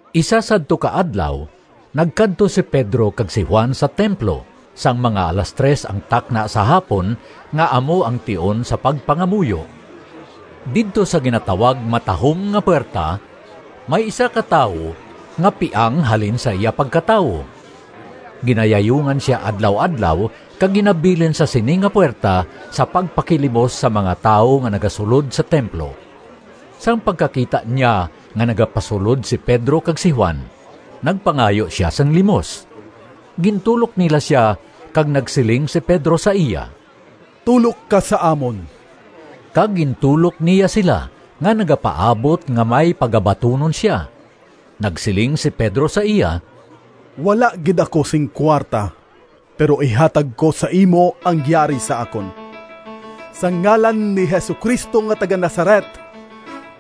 Isa sadto ka adlaw nagkadto si Pedro kag si Juan sa templo sang mga alas tres ang takna sa hapon, nga amo ang tion sa pagpangamuyo. Didto sa ginatawag “Matahom nga Puwerta,” may isa ka tawo nga piang halin sa iya pagkatawo. Ginayayungan sia adlaw-adlaw kag ginabilin sa sini nga puwerta sa pagpakilimos sa mga tawo nga nagasulod sa templo. Sang pagkakita niya nga nagapasulod si Pedro kag si Juan, nagpangayo sia sing limos. Gintulok nila sia kag nagsiling si Pedro sa iya, “Tulok ka sa amon!” Kag gintulok niya sila nga nagapaabot nga may pagabatunon sia. Nagsiling si Pedro sa iya, “Wala gid ako sing kuwarta, pero ihatag ko sa imo ang yari sa akon: sa ngalan ni Jesu-Cristo nga taga-Nazaret,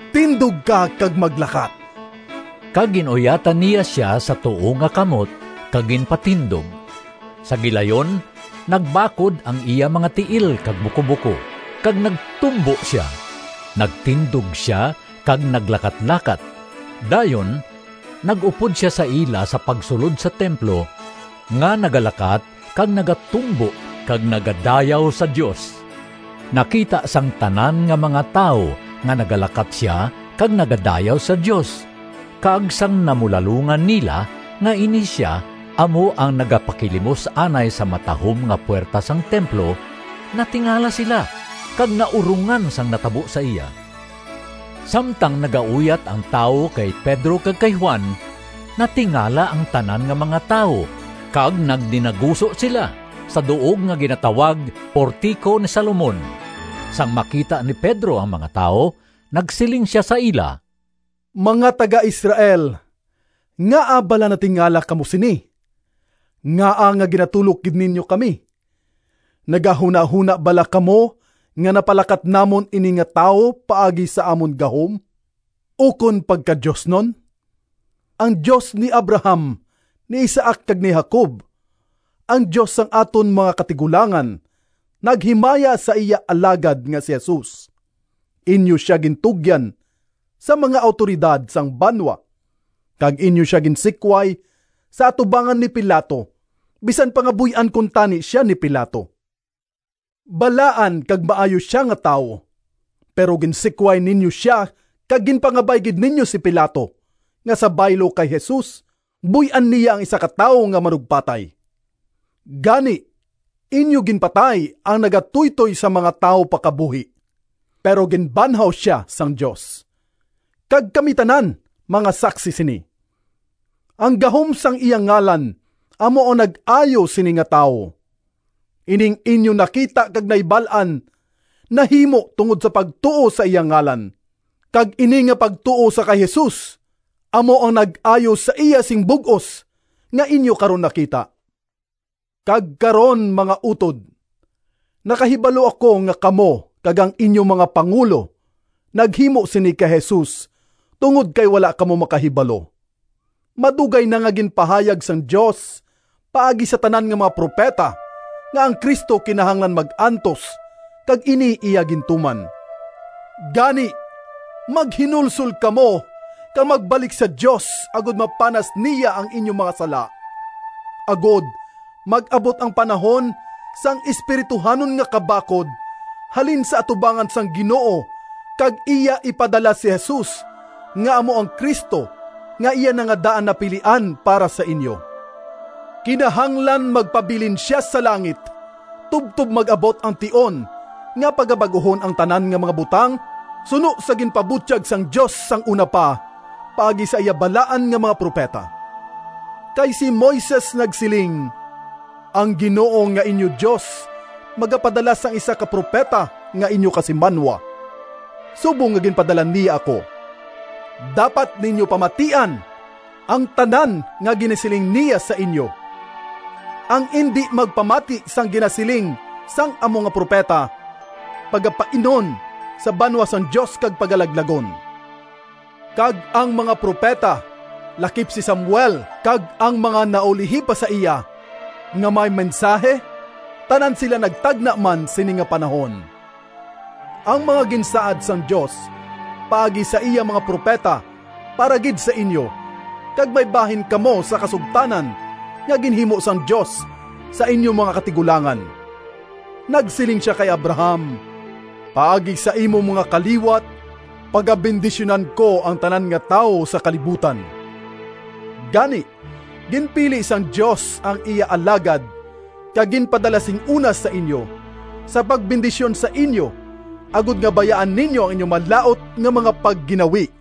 tindog ka kag maglakat!” Kag gin-uyatan niya sia sa tuo nga kamot kag ginpatindog. Sa gilayon nagbakod ang iya mga tiil kag bukobuko kag nagtumbo sia. Nagtindog sia kag naglakatlakat. Dayon nag-upod sia sa ila sa pagsulod sa templo nga nagalakat kag nagatumbo kag nagadayaw sa Dios. Nakita sang tanan nga mga tawo nga nagalakat sia kag nagadayaw sa Dios, kag sang namulalongan nila nga ini sia amo ang nagapakilimos anay sa “Matahom nga Puwerta” sang templo, natingala sila kag naurongan sang natabo sa iya. Samtang nagauyat ang tawo kay Pedro kag kay Juan, natingala ang tanan nga mga tawo kag nagdinaguso sila sa duog nga ginatawag “Portico ni Salomon.” Sang makita ni Pedro ang mga tawo, nagsiling sia sa ila, “Mga taga-Israel, ngaa bala natingala kamo sini? Ngaa nga ginatulok gid ninyo kami? Nagahunahona bala kamo nga napalakat namon ini nga tawo paagi sa amon gahom ukon pagkadiosnon? Ang Dios ni Abraham, ni Isaac kag ni Jacob, ang Dios sang aton mga katigulangan naghimaya sa iya Alagad nga si Jesus. Inyo sia gintugyan sa mga awtoridad sang banwa kag inyo sia ginsikway sa atubangan ni Pilato bisan pa nga buy-an kuntani sia ni Pilato. Balaan kag maayo sia nga tawo, pero ginsikway ninyo sia kag ginpangabay gid ninyo si Pilato nga sa baylo kay Jesus, buy-an niya ang isa ka tawo nga manugpatay. Gani inyo ginpatay ang nagatuytoy sang mga tawo pa kabuhi, pero ginbanhaw sia sang Dios, kag kami tanan mga saksi sini. Ang gahom sang iya ngalan amo ang nag-ayo sini nga tawo. Ining inyo nakita kag nahibal-an nahimo tungod sa pagtuo sa iya ngalan, kag ini nga pagtuo sa kay Jesus amo ang nag-ayo sa iya sing bug-os nga inyo karon nakita. “Kag karon, mga utod, nakahibalo ako nga kamo kag ang inyo mga pangulo naghimo sini kay Jesus, tungod kay wala kamo makahibalo. Madugay na nga ginpahayag sang Dios paagi sa tanan nga mga propeta nga ang Cristo kinahanglan mag-antos, kag ini iya gintuman. Gani maghinulsol kamo kag magbalik sa Dios agod mapanas niya ang inyo mga sala, agod mag-abot ang panahon sang espirituhanon nga kabakod halin sa atubangan sang Ginoo kag iya ipadala si Jesus nga amo ang Cristo nga iya na nga daan napilian para sa inyo. Kinahanglan magpabilin sia sa langit tubtob mag-abot ang tion nga pagabag-uhon ang tanan nga mga butang suno sa ginpabutyag sang Dios sang una pa paagi sa iya balaan nga mga propeta. Kay si Moises nagsiling, ‘Ang Ginoo nga inyo Dios magapadala sang isa ka propeta nga inyo kasimanwa, subong nga ginpadala niya ako. Dapat ninyo pamatian ang tanan nga ginasiling niya sa inyo. Ang indi magpamati sang ginasiling sang amo nga propeta pagapainon sa banwa sang Dios kag pagalaglagon.’ Kag ang mga propeta, lakip si Samuel kag ang mga naulihi pa sa iya, nga may mensahi, tanan sila nagtagna man sini nga panahon. Ang mga ginsaad sang Dios paagi sa iya mga propeta para gid sa inyo, kag may bahin kamo sa kasugtanan nga ginhimo sang Dios sa inyo mga katigulangan. Nagsiling sia kay Abraham, ‘Paagi sa imo mga kaliwat pagabendisyunan ko ang tanan nga tawo sa kalibutan.’ Gani ginpili sang Dios ang iya Alagad kag ginpadala sing una sa inyo, sa pagbendisyon sa inyo agod nga bayaan ninyo ang inyo malaut nga mga pagginawi.”